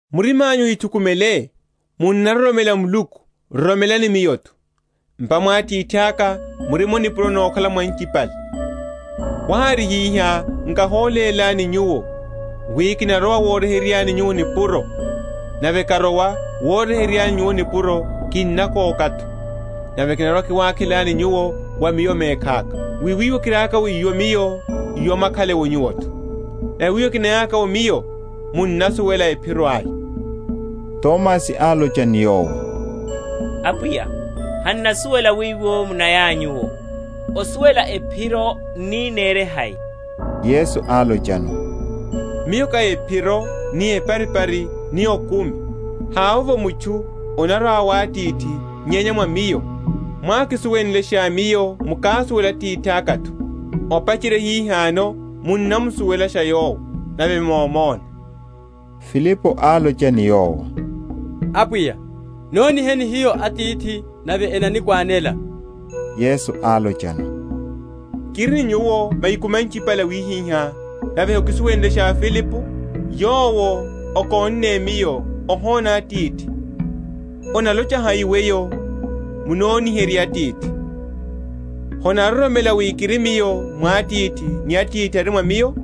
Murima’nyu ohithukumele: munnaroromela Muluku, roromelani Miyo’tho. M’pa mwa Atithaka murimo nipuro nokhala’mo anchipale. Wahári hihá, nkahólélani nyuwo; wi kinarowa woryeheryelani nyuwo nipuro. Nave karowa woryeheryelani nyuwo nipuro, kinakoka’tho, nave kinarwa‐kiwakhelani nyuwo wa Miyo mekhaka; wi wiwo kiriaka’wo Miyo iwo, mwakhale nyuwo’tho. Nave wiwo kiniya’ka’wo Miyo, munnasuwela ephiro aya. Tomasi álocha ni Yowo, Apwiya, han’nasuwela wiwo munayanyu’wo; osuwela ephiro n’ni nirihai? Yesu álochano, Miyo ká ephiro, ni eparipari, ni okumi. Havovo mutchu anarwa wa Atithi, nyenya mwa Miyo. Mwákisuwenlesha Miyo mukásuwela Atithaka’tho; opacherya hihano munnamusuwelasha Yowo, nave momona. Filipo álocha ni Yowo, Apwiya, noniheni hiyo Atithi, nave enani?-?khwanela. Yesu álochano, Kiri ni nyuwo mahiku manchipale awihiha, nave hokisuwenlesha, Filipo? Yowo okónne Miyo ohona Atithi; onalocha hai weyo, Munoniherye Atithi? Honaroromela wi kiri Miyo mwa Atithi, ni Atithi ari mwa Miyo?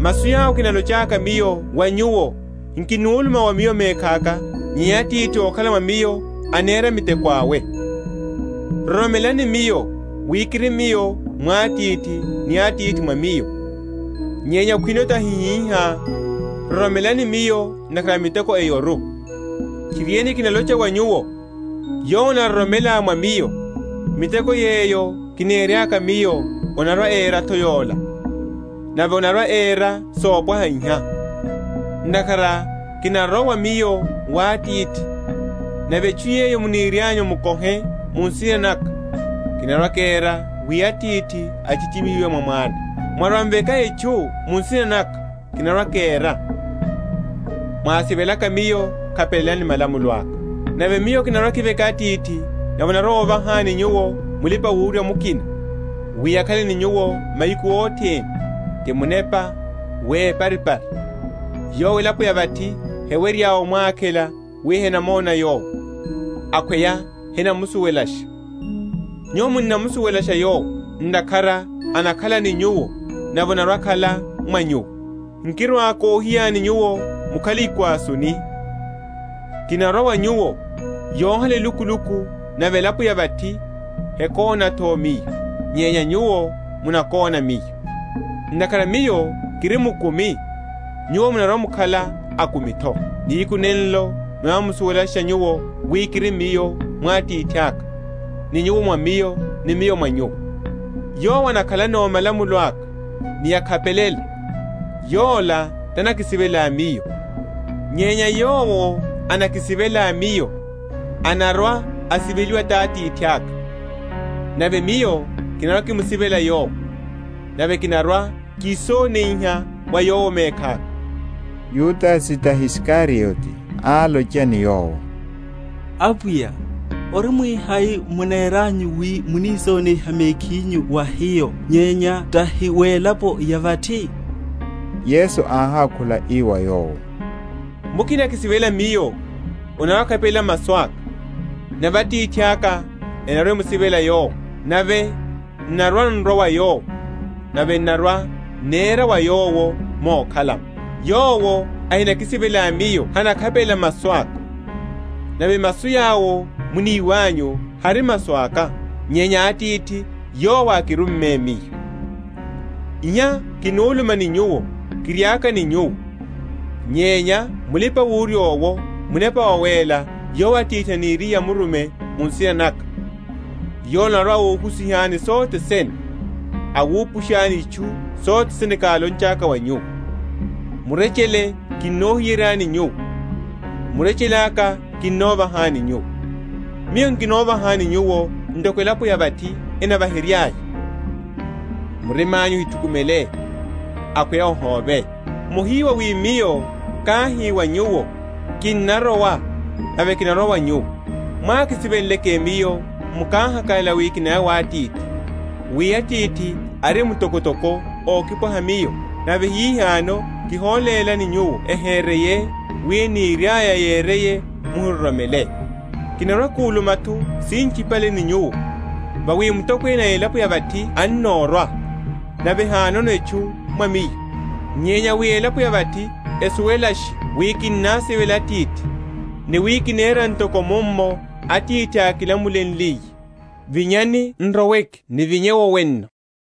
Masu yawo kinalochaka Miyo wa nyuwo nkinuluma wa Miyo mekhaka; nyenya Atithi ókhala mwa Miyo anera miteko awe. Roromelani Miyo, wi kiri Miyo mwa Atithi ni Atithi mwa Miyo; nyenya khwino tahi hihá, roromelani Miyo ntakhara a miteko eyoru. Tchiriene, kinalocha wa nyuwo, Yowo anaroromela mwa Miyo, miteko yeyo kineraka Miyo anarwa‐era’tho yola; nave anarwa‐era sopwaha iha; ntakhara kinarowa Miyo wa Atithi. Nave etchu yeyo munirianyu mukohe mu nsina naka, kinarwa‐kera, wi Atithi achiehimihiwe mwa Mwana. Mwarwa‐m’veka etchu mu nsina naka, kinarwa‐kera. Mwásivelaka Miyo, khapelelani malamulo aka. Nave Miyo kinarwa‐kiveka Atithi, nave anarwa‐ovahani nyuwo Mulipa‐wurya mukina, wi akhale ni nyuwo mahiku othene, ti Munepa wa eparipari: Yowo elapo ya vathi hewerya omwakhela, wi henamona Yowo, akhweya henamusuwelasha. Nyuwo munnamusuwelasha Yowo; ntakhara anakhala ni nyuwo nave anarwa‐akhala mwa nyuwo. Nkirwa‐kohiyani nyuwo mukhale ikwasuni: kinarwa wa nyuwo. Yohala elukuluku, nave elapo ya vathi hekóna’tho Miyo; nyenya nyuwo munakóna Miyo: ntakhara Miyo kiri mukumi nyuwo munarwa‐mukhala akumi’tho. Nihiku nenlo munarwa‐musuwelasha nyuwo wi kiri Miyo mwa Atithaka, ni nyuwo mwa Miyo, ni Miyo mwa nyuwo. Yowo anakhalano malamulo aka, ni okhapelela, yola tanakisivela Miyo: nyenya yowo anakisivela Miyo anarwa‐asiveliwa ti Atithaka, nave Miyo kinarwa‐kimusivela yowo, nave kinarwa‐kisoniha wa yowo mekhaka. Yudase, tahi Isikariote, álocha ni Yowo, Apwiya, orimwihai muneranyu wi munisoniha mekhinyu wa hiyo, nyenya tahi welapo ya vathi? Yesu áhákhula ii wa yowo, Mukina akisivela Miyo, anarwa‐akhapelela masu aka; nave Atithaka anarwa‐amusivela yowo, nave, n’narwa‐n’rwa wa yowo, nave n’narwa‐nera wa yowo mokhala’mo. Yowo ahinakisivela Miyo hanakhapelela masu aka; nave masu yawo muniwanyu hari masu aka, nyenya a Atithi yowo ákirumme Miyo. Iha kinuluma ni nyuwo, kiriaka ni nyuwo. Nyenya Mulipawurya owo, Munepa Wawéla, yowo Atithi aniriye amurume mu nsina naka, yola anarwa‐ohusihani sothe sene, awupushani itchu sothene kálonchaka wa nyuwo. Murechele kinohiyeryani nyuwo, murechele aka kinovahani nyuwo. Miyo nkinovahani nyuwo ntoko elapo ya vathi enavaheryaya. Murima’nyu ohithukumele, akhweya ohóve. Mohiwa wi Miyo káhi wa nyuwo, Kinnarowa, nave kinarwa wa nyuwo. Mwákisivenleke Miyo, mukáhakalala wi kinaya wa Atithi: wi Atithi ari mtokotoko ókipwaha Miyo. Nave hihano kiholélani nyuwo ehereiye, wi eniriaya yereye mwaroromele. Nkirwa‐kuluma’tho sinchipale ni nyuwo, vawi mutokwene a elapo ya vathi annorwa: nave hanono etchu mwa Miyo. Nyenya wi elapo ya vathi esuwelashe wi kinnasivela Atithi, ni wi kinera ntoko mummo Atithi ákilamulenliye, Vinyani n’roweke nivinye’wo wenno.